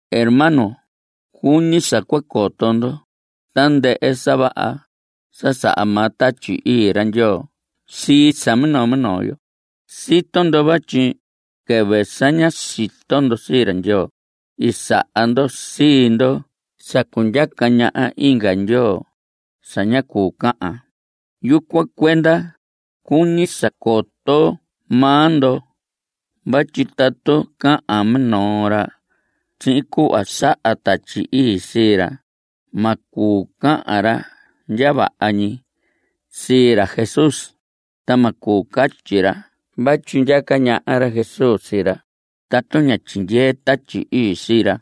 Hermanos, cuñi sa cua coto ndo tandɨhɨ sa vaha sa saha maa Tatyi Ii ra Ndyoo sii sa minoo minoo yo. Sito ndo vatyi quɨvɨ sa ña sito ndo sii ra Ndyoo, i saha ndo sii ndo sa cundyaca ñaha inga ndyoo sa ña cuu cahan. Yucuan cuenda cuñi sa coto maa ndo vatyi tatu cahan minoo ra sihin cuhva saha Tatyi Ii sii ra, ma cuu cahan ra ndya vaha ñi sii ra Jesús. Ta ma cuu catyi ra vatyi ndyaca ñaha ra Jesús sii ra tatu ña tyindyee Tatyi Ii sii ra.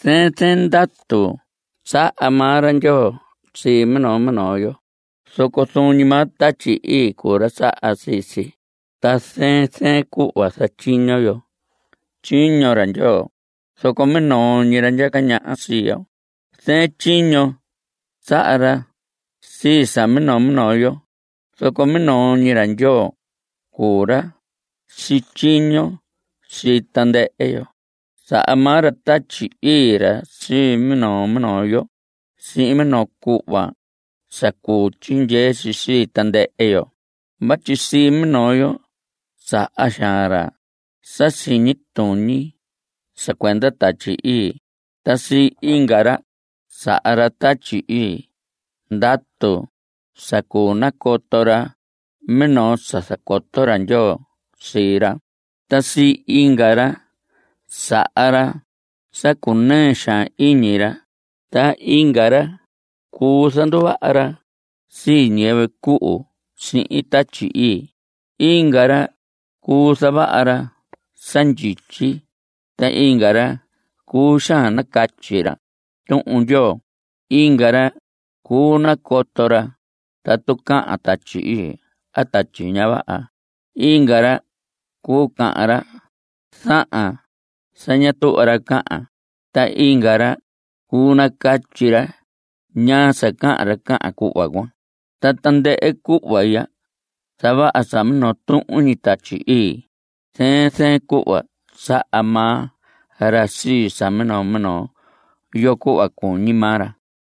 Zɨɨn zɨɨn ndatu saha maa ra Ndyoo sii minoo minoo yo. Zoco zuun ñi maa Tatyi Ii cuu ra saha sii si. Ta zɨɨn zɨɨn cuhva zatyiño yo tyiño ra Ndyoo, zoco minoo ñi ra ndyaca ñaha sii yo. Zɨɨn tyiño saha ra sii sa minoo minoo yo, zoco minoo ñi ra Ndyoo cuu ra sityiño sii tandɨhɨ yo. Saha maa ra Tatyi Ii ra sii minoo minoo yo sihin minoo cuhva sa cuu tyindyee si sii tandɨhɨ yo. Vatyi sii minoo yo saha xaan ra sa siñi tuñi sa cuenda Tatyi Ii. Ta sii inga ra saha Tatyi Ii ndatu sa cuu nacoto ra minoo sa zacoto ra Ndyoo sii ra. Ta sii inga ra saha ra sa cunɨɨ xaan iñi ra. Ta inga ra cuu zanduvaha ra sii ñiyɨvɨ cuhu sihin Tatyi Ii. Inga ra cuu zavaha ra sa ndyityi. Ta inga ra cuu xaan nacatyi ra Tuhun Ndyoo. Inga ra cuu nacoto ra tatu cahan Tatyi Ii a tatyi ña vaha; inga ra cuu cahan ra zahan sa ña tuhva ra cahan; ta inga ra cuu nacatyi ra ñaa sa cahan ra cahan cuhva cuan. Ta tandɨhɨ cuhva ya zavaha sa minoo tuhun ñi Tatyi Ii; zɨɨn zɨɨn cuhva saha maa ra sii sa minoo minoo yo cuhva cuñi maa ra.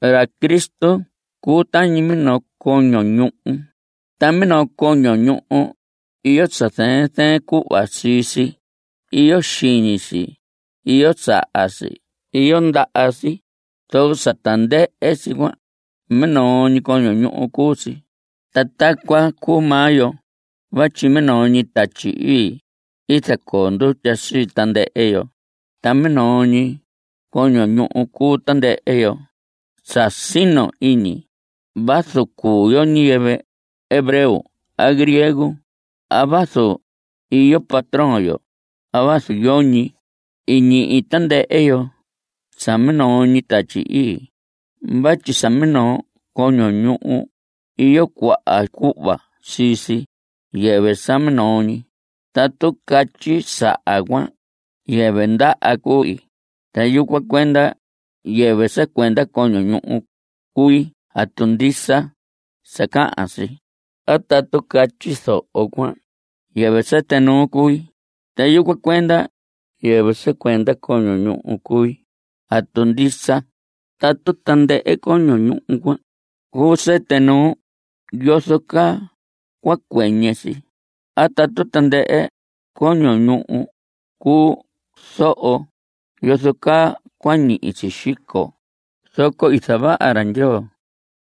Ra Cristo cuu tañi minoo coño ñuhu. Ta minoo coño ñuhu iyo sa zɨɨn zɨɨn cuhva sii si. Iyo xiñi si, iyo saha si, iyo ndaha si. Zoco sa tandɨhɨ si cuan minoo ñi coño ñuhu cuu si. Ta tacuan cuu maa yo vatyi minoo ñi Tatyi Ii i zacoo ndutya sii tandɨhɨ yo, ta minoo ñi coño ñuhu cuu tandɨhɨ yo sa sino iñi vazu cuu yo ñiyɨvɨ hebreo a griego a vazu iyo patrón yo a vazu yoñi. I ñihi tandɨhɨ yo sa minoo ñi Tatyi Ii vatyi sa minoo coño ñuhu, iyo cuaha cuhva sii si, yɨvɨ sa minoo ñi. Tatu catyi saha cuan: “Yɨvɨ ndaha cui, ta yucuan cuenda yɨvɨ sa cuenda coño ñuhu cui.” ¿Atu ndisa sa cahan si? A tatu catyi zoho cuan: “Yɨvɨ sɨtɨ nuu cui, ta yucuan cuenda yɨvɨ sa cuenda coño ñuhu cui.” ¿Atu ndisa? Tatu tandɨhɨ coño ñuhu cuan cuu sɨtɨ nuu, ¿yozo caa cua cuɨñɨ si? A tatu tandɨhɨ coño ñuhu cuu zoho, ¿yozo caa cua ñihi si xico? Zoco i zavaha ra Ndyoo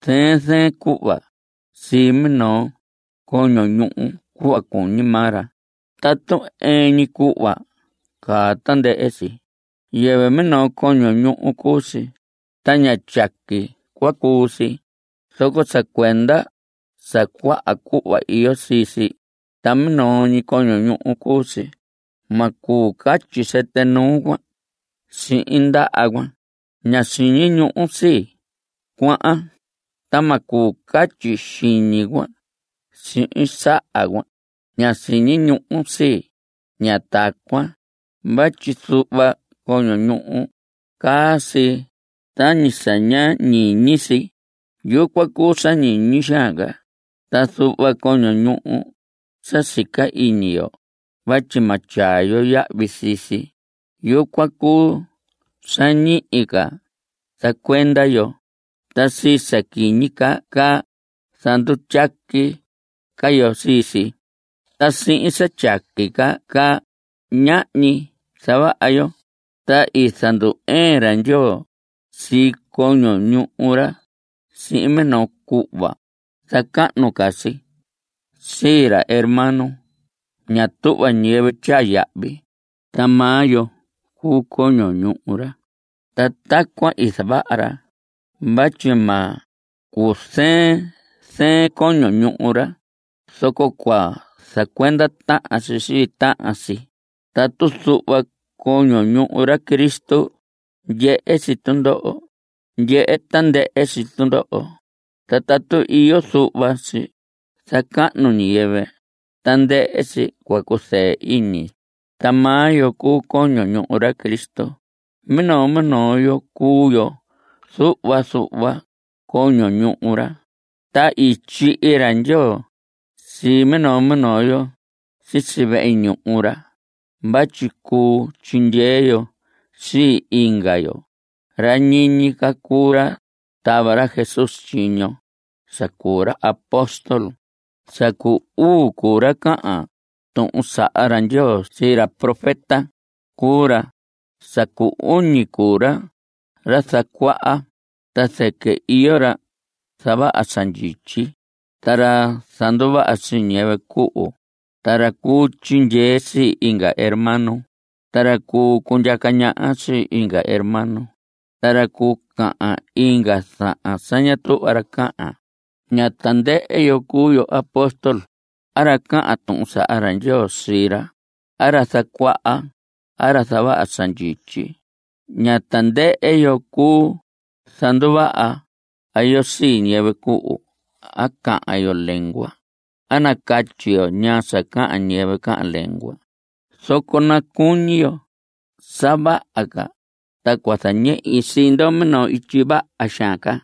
zɨɨn zɨɨn cuhva sihin minoo coño ñuhu cuhva cuñi maa ra. Tatu ɨɨn ñi cuhva caa tandɨhɨ si, yɨvɨ minoo coño ñuhu cuu si, ta ña tyaqui cua cuu si. Zoco sa cuenda sa cuaha cuhva iyo sii si, ta minoo ñi coño ñuhu cuu si. Ma cuu catyi sɨtɨ nuu cuan sihin ndaha cuan: “Ña siñi ñuhun sii, cuahan.” Ta ma cuu catyi xiñi cuan sihin saha cuan: “Ña siñi ñuhun sii.” Ña tacuan, vatyi zuhva coño ñuhu caa si tañi sa ña ñiñi si, yucuan cuu sa ñiñi xaan ca. Ta zuhva coño ñuhu sa sica iñi yo vatyi ma tyaa yo yahvi sii si, yucuan cuu sa ñihi ca zacuenda yo. Ta sii sa quiñi ca caa, zandutyaqui ca yo sii si. Ta sihin sa tyaqui ca caa, ñahñi zavaha yo. Ta i zandu‑ɨɨn ra Ndyoo sii coño ñuhu ra sihin minoo cuhva zacahnu ca si sii ra hermano ña tuhva ñiyɨvɨ tyaa yahvi. Ta maa yo cuu coño ñuhu ra. Ta tacuan i zavaha ra vatyi ma cuzɨɨn zɨɨn coño ñuhu ra, zoco cua zacuenda tahan si sii tahan si. Tatu zuhva coño ñuhu ra Cristo ndyehe si tundoho, ndyehe tandɨhɨ si tundoho. Ta tatu iyo zuhva si zacahnu ñiyɨvɨ, tandɨhɨ si cua cuzɨɨ iñi. Ta maa yo cuu coño ñuhu ra Cristo. Minoo minoo yo cuu yo zuhva zuhva coño ñuhu ra. Ta i tyihi ra Ndyoo sii minoo minoo yo sisi vehe ñuhu ra vatyi cuu tyindyee yo sii inga yo. Ra ñiñi ca cuu ra tava ra Jesús tyiño sa cuu ra apóstol. Sa cu uu cuu ra cahan tuhun saha ra Ndyoo sii ra; profeta cuu ra. Sa cu uñi cuu ra zacuaha. Ta zɨquɨ iyo ra zavaha sa ndyityi, ta ra zanduvaha sii ñiyɨvɨ cuhu, ta ra cuu tyindyee sii inga hermano, ta ra cuu cundyaca ñaha sii inga hermano, ta ra cuu cahan inga zahan sa ña tuhva ra cahan. Ña tandɨhɨ yo cuu yo apóstol a ra cahan tuhun saha ra Ndyoo sii ra, a ra zacuaha, a ra zavaha sa ndyityi. Ña tandɨhɨ yo cuu zanduvaha yo sii ñiyɨvɨ cuhu a cahan yo lengua a nacatyi yo ñaa sa cahan ñiyɨvɨ cahan lengua. Zoco nacuñi yo sa vaha ca. Ta cua zañehi sii ndo minoo ityi vaha xaan ca.